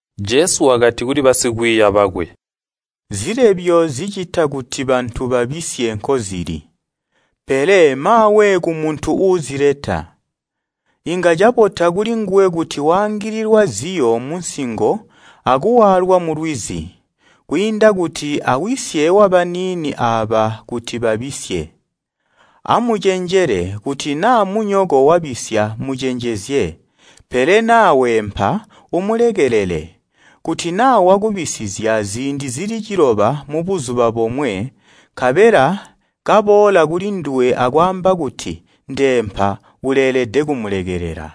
Jesu wakati kuli basikwiiya bakwe, “Zilebyo zicita kuti bantu babisye nkozili, pele maawe kumuntu uuzileta! Inga cabota kulinguwe kuti waangililwa ziyo munsingo akuwaalwa mulwizi, kwiinda kuti awisye wabaniini aaba kuti babisye. Amucenjele! Kuti naa munyoko wabisya mucenjezye, pele naa weempa, umulekelele. Kuti naa wakubisizya ziindi zili ciloba mubuzuba bomwe, nkabela kaboola kulinduwe akwaamba kuti, ‘Ndeempa’ uleelede kumulekelela.”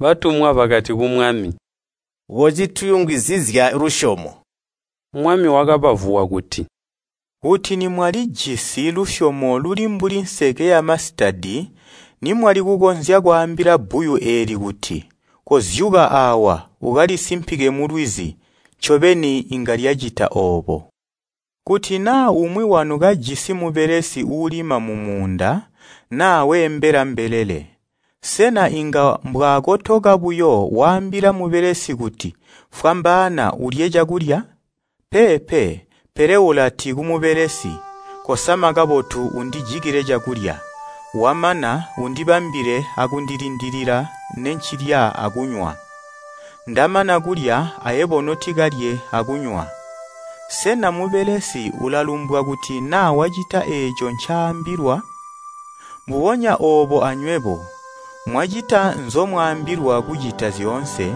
Batumwa bakati ku Mwami, “Kocituyungizizya lusyomo!” Mwami wakabavuwa kuti, “Kuti nimwalijisi lusyomo luli mbuli nseke yamasitadi nimwali kukonzya kwaambila bbuyu eeli kuti, ‘Kozyuka aawa, ukalisimpike mulwizi!’ ncobeni inga lyacita oobo. “Kuti naa umwi wanu kajisi mubelesi uulima mumuunda naa weembela mbelele, sena inga mbwaakotoka buyo waambila mubelesi kuti, ‘Fwambaana, ulye cakulya?’ Peepe! Pele ulati kumubelesi, ‘Kosama kabotu, undijikile cakulya, wamana, undibambile akundilindilila nencilya akunywa. Ndamana kulya, ayebo notikalye akunywa.’ Sena mubelesi ulalumbwa kuti naa wacita eeco ncaambilwa. Mbubonya oobo anywebo, mwacita nzomwaambilwa kucita zyoonse,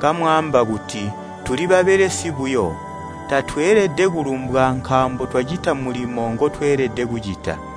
kamwaamba kuti, ‘Tuli babelesi buyo. Tatweelede kulumbwa nkaambo twacita mulimo ngotweelede kucita!’”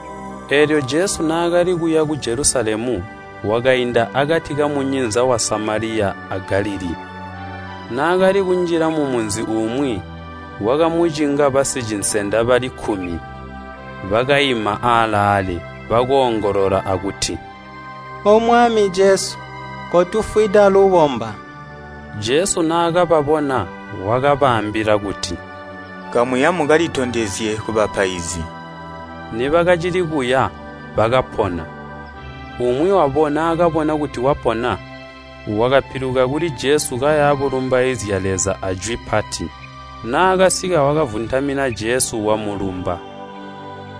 Eelyo Jesu naakali kuya ku Jelusalemu wakainda akati kamunyinza wa Samaliya a Galilii. Naakali kunjila mumunzi umwi, kwakamucinga basicinsenda bali kkumi. Bakaima aalaale, bakoongolola akuti, “O Mwami Jesu! Kotufwida lubomba!” Jesu naakababona, wakabaambila kuti, “Kamuya mukalitondezye kubapaizi.” Nibakacili kuya bakapona. Umwi wabo naakabona kuti wapona, wakapiluka kuli Jesu kaya bulumbaizya Leza ajwi pati. Naakasika, wakavuntamina Jesu, wamulumba.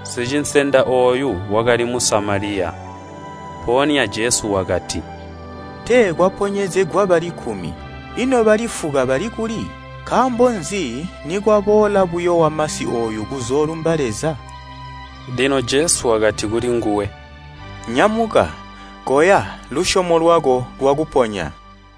Sicinsenda ooyu wakali Musamaliya. Mpoonya Jesu wakati, “Tee kwaponyezegwa bali kkumi, ino bali fuka bali kuli? Nkaambo nzi nikwaboola buyo wamasi ooyu kuzoolumba Leza?” Lino Jesu wakati kulinguwe, “Nyamuka, koya lusyomo lwako lwakuponya.”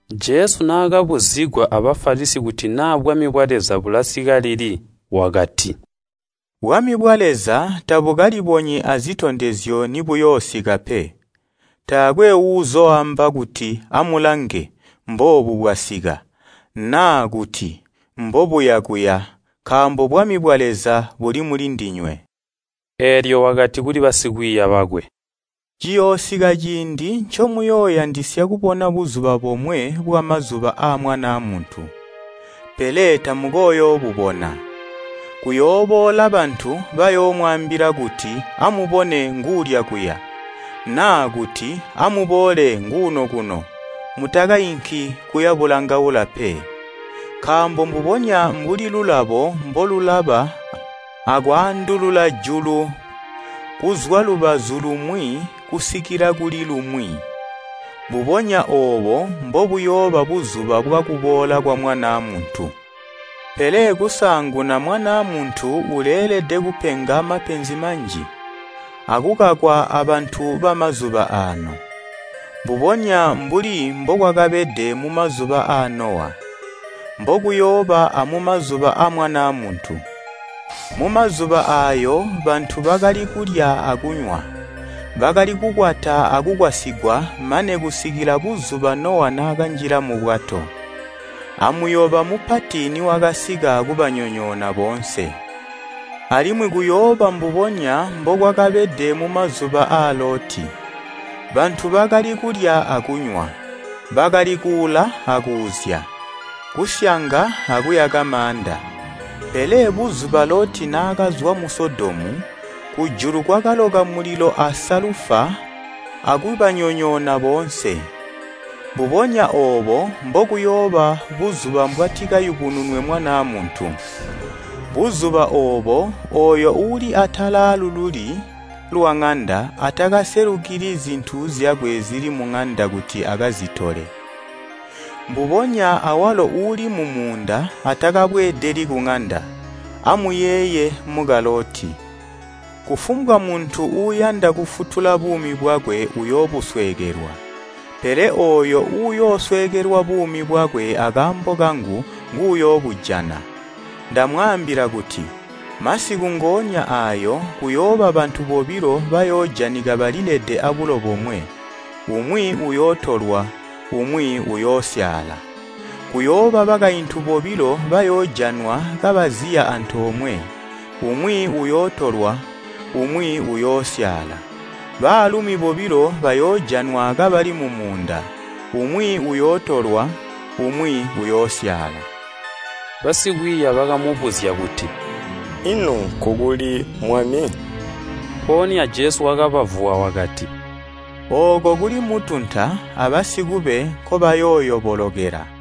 Jesu naakabuzigwa a Bafalisi kuti naa bwami bwa Leza bulasika lili wakati, “Bwami bwa Leza tabukalibonyi azitondezyo nibuyoosika pe. Taakwe uuzooamba kuti ‘Amulange, mboobu bwasika,’ naa kuti, ‘Mbobuya kuya’ nkaambo Bwami bwa Leza buli mulindinywe.” Eelyo wakati kuli basikwiiya bakwe, “Ciyoosika ciindi ncomuyooyandisya kubona buzuba bomwe bwamazuba aa Mwanaa Muntu, pele tamukooyoobubona. Kuyooboola bantu, bayoomwaambila kuti ‘Amubone, nguulya kuya’ naa kuti, ‘Amuboole, nguuno kuno!’ Mutakainki kuya bulangaula pe. Nkaambo mbubonya mbuli lulabo mbolulaba akwaandulula julu kuzwa lubazu lumwi kusikila kuli lumwi, mbubonya oobo mbobuyooba buzuba bwakuboola kwa Mwanaa Muntu. Pele kusaanguna Mwanaa Muntu uleelede kupenga mapenzi manji, akukakwa abantu bamazuba aano. Mbubonya mbuli mbokwakabede mumazuba aa Nowa, mbokuyooba amumazuba aa Mwanaa Muntu. Mumazuba aayo bantu bakali kulya akunywa, bakali kukwata akukwasigwa mane kusikila buzuba Nowa naakanjila mubwato, amuyoba mupati niwakasika kubanyonyoona boonse. “Alimwi kuyooba mbubonya mbokwakabede mumazuba aa Loti. Bantu bakali kulya akunywa, bakali kuula akuuzya, kusyanga akuyaka maanda. Pele buzuba Loti naakazwa mu Sodomu, kujulu kwakaloka mulilo asalufa akubanyonyoona boonse. Mbubonya oobo mbokuyooba buzuba mbwatikayubununwe Mwanaa Muntu. “Buzuba oobo, ooyo uuli atala aalululi lwaŋanda atakaselukili zintu zyakwe zili muŋanda kuti akazitole, mbubonya awalo uuli mumuunda atakabweedeli kuŋanda. Amuyeeye muka Loti! “Kufumbwa muntu uuyanda kufutula buumi bwakwe uyoobusweekelwa, pele ooyo uuyoosweekelwa buumi bwakwe akaambo kangu, nguuyoobujana. “Ndamwaambila kuti, masiku ngoonya aayo kuyooba bantu bobilo bayoojanika balilede abulo bomwe, umwi uyootolwa, umwi uyoosyaala. Kuyooba bakaintu bobilo bayoojanwa kabaziya antoomwe, umwi uyootolwa umwi uyoosyaala. [ Baalumi bobilo bayoojanwa kabali mumuunda, umwi uyootolwa, umwi uyoosyaala.” Basikwiiya bakamubuzya kuti, “Ino nkukuli, Mwami?” Mpoonya Jesu wakabavuwa wakati, “Ooko kuli mutunta abasikube nkoobayooyobolokela.”